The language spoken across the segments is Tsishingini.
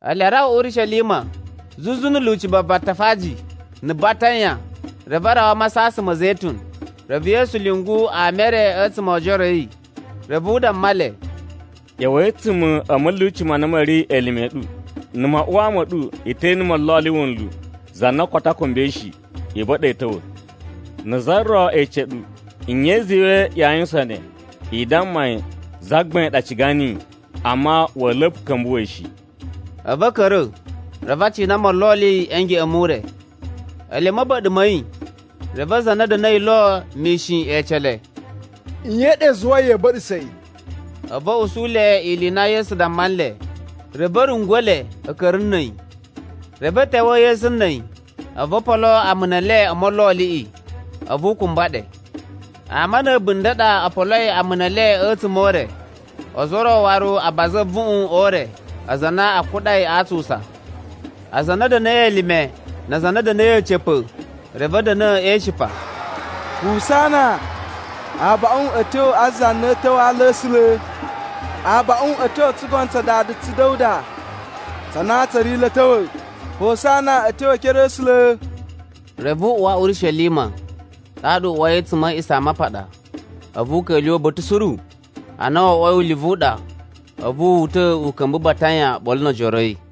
Ele arawa Urishelima, zuzu na̱ lyuci va Batafaji na̱ Batanya, reve a rawa a Masasan ma̱ Zetun. Reve Yesu lyungu ama e re a̱tsuma̱ o ojoro a̱ yi. Reve u damma le, “ꞌYa̱wa̱i a̱tsuma̱ a̱ ma̱lyuci ma na ma̱ ri elime a̱ ɗu, na̱ maꞌuwaa ma̱ ɗu i te ene molloli wunlu za na koto a kumbai shi. I ba̱ɗa̱ yi a̱ ta̱wa̱. Na̱ za ro ece ɗu, nye i zuwai yaa yuwusan ne? I damma yi, ‘Zagbain ɗa ciga niyi, amma wa̱a̱ la̱pa̱ ka̱mbuwa̱ yi shi.’” A̱vu a̱ ka̱ra̱, reve a cina molloli a̱ ngeꞌen mu ure. Ele a̱ ma̱ba̱ɗa̱ ma̱ yi, reve aza a na a̱ da̱na̱i lo mishin e ece le, “Nye ɗa i zuwai ya̱a̱ ba̱ɗa̱sa̱ yi?” A̱vu a̱ usu le ili i na Yesu damma nle. Reve a̱ rungwa̱ le a̱ ka̱ra̱ na̱ a̱yi. Reve a̱ ta̱wa̱a̱ Yesu na̱ a̱yi, a̱vu o polo amuna e le o molloliꞌi. A̱vu u kumba ɗe. Ama na̱ a̱bunda̱ ɗa o poloi amuna e le a̱tsuma̱ o ure, ozo o ro waru a baza a̱vuꞌun o ure, aza a na a kuɗai a atsusa. Aza a na a̱ da̱na̱i elime na aza a na a̱ da̱na̱i a̱ca̱pa̱, reve a̱ da̱na̱ e ishipa, “Husana! “Abaꞌun a̱ tyo a za na a̱ ta̱wa̱ a ala a̱ A̱sula̱! “Abaꞌun a̱ tyo o tsugono tsa dada tsu Da̱wuda tsa na tsa̱ ri lo a̱ ta̱wa̱! “Husana a̱ tyo e ekere a̱ A̱sula̱!” Reve u uwa Urishelima, ɗaɗa u uwai a̱tsuma̱ a̱ A̱a̱ꞌisamapaɗa. A̱vu u ka̱lyuwa̱ uba̱ta̱ suru. Ana wo oꞌwoi ulivu u ɗa, a̱vu wu uta̱ u ka̱mba̱ Batanya oɓolo no ojoro a̱ yi.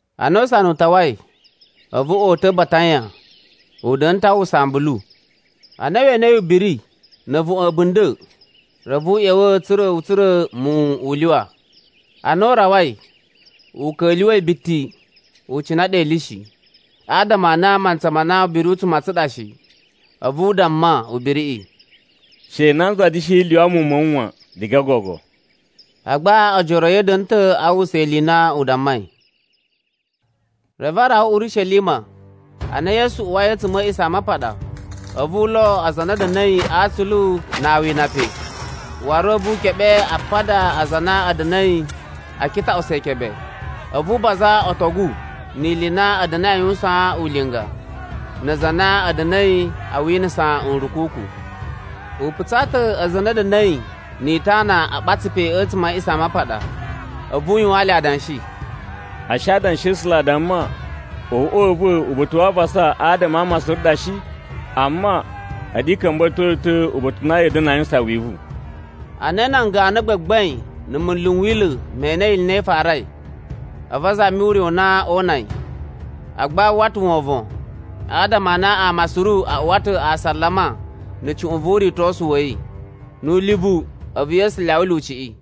Ana usana u tawai, a̱vu o uta̱ Batanya. U da̱na̱ ta̱ a uwwusa ambulu. Ana we enei ubiri na̱ a̱vuꞌun a̱ a̱bunda̱, reve u ꞌya̱wa̱ tsa̱ra̱ u tsura̱ muwun u lyuwa. Ana u rawai, u ka̱lyuwa̱i biti, u cina ɗe ili shi, adama a na a mantsa ma na ubiri u tsu matsan ɗa shi. A̱vu u damma ubiriꞌi, “She nanza da̱shi lyuwa muwun ma̱ wu wan, diga gogo.” Agba ojoro a̱ yi a̱ da̱na̱ ta̱ a uwwusa ili i na u dammai. Reve a rawa Urishelima. Ana Yesu uwai a̱tsuma̱ a̱ A̱a̱ꞌisamapaɗa, a̱vu u lo aza a na a̱ da̱na̱i atsulu na awina pe. Waru a̱vu wu keɓe apada a aza a na a̱ da̱na̱i a kitaꞌusa ikebe, a̱vu u baza otogu ni ili i na a̱ da̱na̱i a yuwusan ulinga, na aza a na a̱ da̱na̱i a winasa nrukuku. U putsa ta̱ aza a na a̱ da̱na̱i ni itana a ɓatsa pe a̱tsuma̱ a̱ A̱a̱ꞌisamapaɗa. A̱vu u yuwaan le adanshi, “Ashe Adanshi a̱ A̱sula̱, a damma, ‘Uꞌwa u va̱ uba̱ta̱ wa avasa adama a ama suru ɗa shi?’ Amma, a̱ɗu i ka̱mba̱to yi ta̱ uba̱ta̱ u na ya̱a̱ da̱na̱ a yuwusan wivu.” Ana nan ganu a gbagbain na̱ munlu n Wila̱ me enei ili i na i farai, a̱vu a zami ure u na oo una yi. Agba a uwwa ta̱ wovon, adama a na ama suru a uwa ta̱ asalama na̱ cuꞌun vu uritosu wa̱ yi. Nu ulivu, a̱vu Yesu lyawa lyuciꞌi.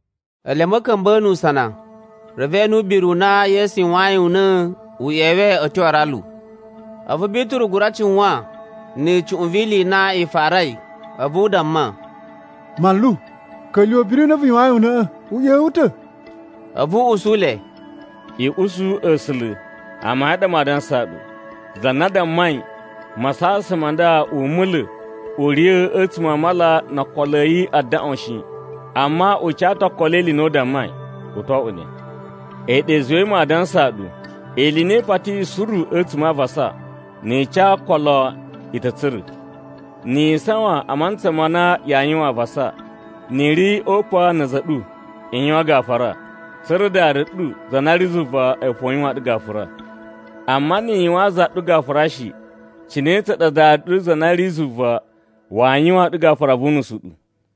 Ele a̱ ma̱ka̱mba̱a̱ nu usana, reve e ene ubiri u na Yesu yuwayin una̱ u ꞌyewe a̱ tyo a aralu. A̱vu Bituru gura cuwan na̱ cuꞌun vi ili i na i farai, a̱vu u damma, “Manlu, ka̱lyuwa̱ ubiri u na vu yuwayin una̱ꞌa̱ u ꞌyewe ta̱.” A̱vu u usu le, “I usu A̱sula̱, amayun a ɗa maa dansaa ɗu, za na dammai masasan ma nda u mula̱ u riya̱ a̱tsuma̱ a mala no okolo a̱ yi a daꞌwan shi, amma u ca ta̱ okolo e ili i na u dammai, u to oꞌwo ne. A̱yi ɗa i zuwai maa dansaa ɗu ili i na i patiyi suru a̱tsuma̱ a avasa, ni i ca okolo i ta̱ tsura̱. Ni yi isawan a mantsa ma na yaa yuwan avasa, ni i ri o upan na̱ a̱za̱ a̱ ɗu, i yuwan gafura, tsa̱ra̱ Dada ɗu za na ri zuva a̱yi fo u yuwaan ɗu gafura. Amma ni i yuwaan za ɗu gafura shi, cine tsa ɗa Dada ɗu za na ri zuva waa yuwaan ɗu gafura vu unusu u ɗu?”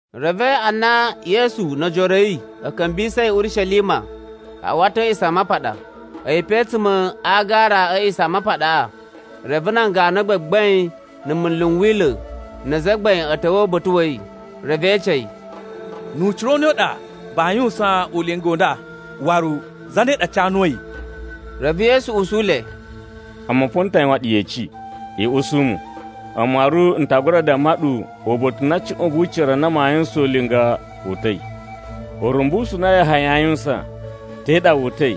Reve ana Yesu no ojoro a̱ yi a̱ ka̱mbisa̱i Urishelima a uwa ta̱ a̱ A̱a̱ꞌisamapaɗa. A̱yi pe a̱tsuma̱ a agara a̱ A̱a̱ꞌisamapaɗaꞌa reve nan ganu a gbagbain na̱ munlu n Wila̱ na azagbain a̱ ta̱wa̱ uba̱ta̱ wa̱ yi. Reve e ece yi, “Nu ucira u ne u ɗa vaa yuwusan ulinga u nda, waru zane ɗa ca nuwu a̱yi?” Reve Yesu usu le, “A̱mu fo n ta yuwan ɗu yeci, i usu mu. A̱mu waru n ta gura damma ɗu uba̱ta̱ u na cuꞌun vu ucira na maa yuwusan ulinga wu uta̱i. Urumbusu u na Yahaya aa yuwusan, te ɗa wu uta̱i,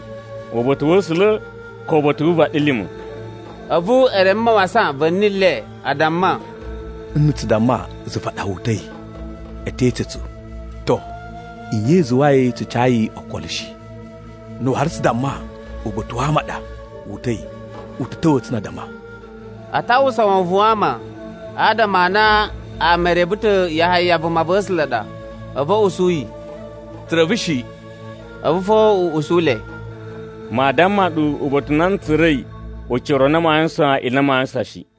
uba̱ta̱ wa̱ A̱sula̱ ko uba̱ta̱ wu vaɗilima̱?” A̱vu e reme mawasan va̱ni le, a damma “Na̱ tsu damma zuva ɗa wu uta̱i, u te ece tsu, ‘To nye i zuwai tsu cayi okolo shi?’ Na̱ waru tsu damma uba̱ta̱ wa ama ɗa wu uta̱i, u ta̱ ta̱wa̱a̱ tsu na addama.” A ta uwwusa wovon wa ama, adama a na ama e reve ta̱ Yahaya vumava̱sula̱ ɗa. A̱vu a̱ usu yi, “Tsu reve shi.” A̱vu fo u usu le, “Maa damma ɗu uba̱ta̱ u na n tsura̱i ucira u na maa yuwusan ili i na maa yuwusan shi.”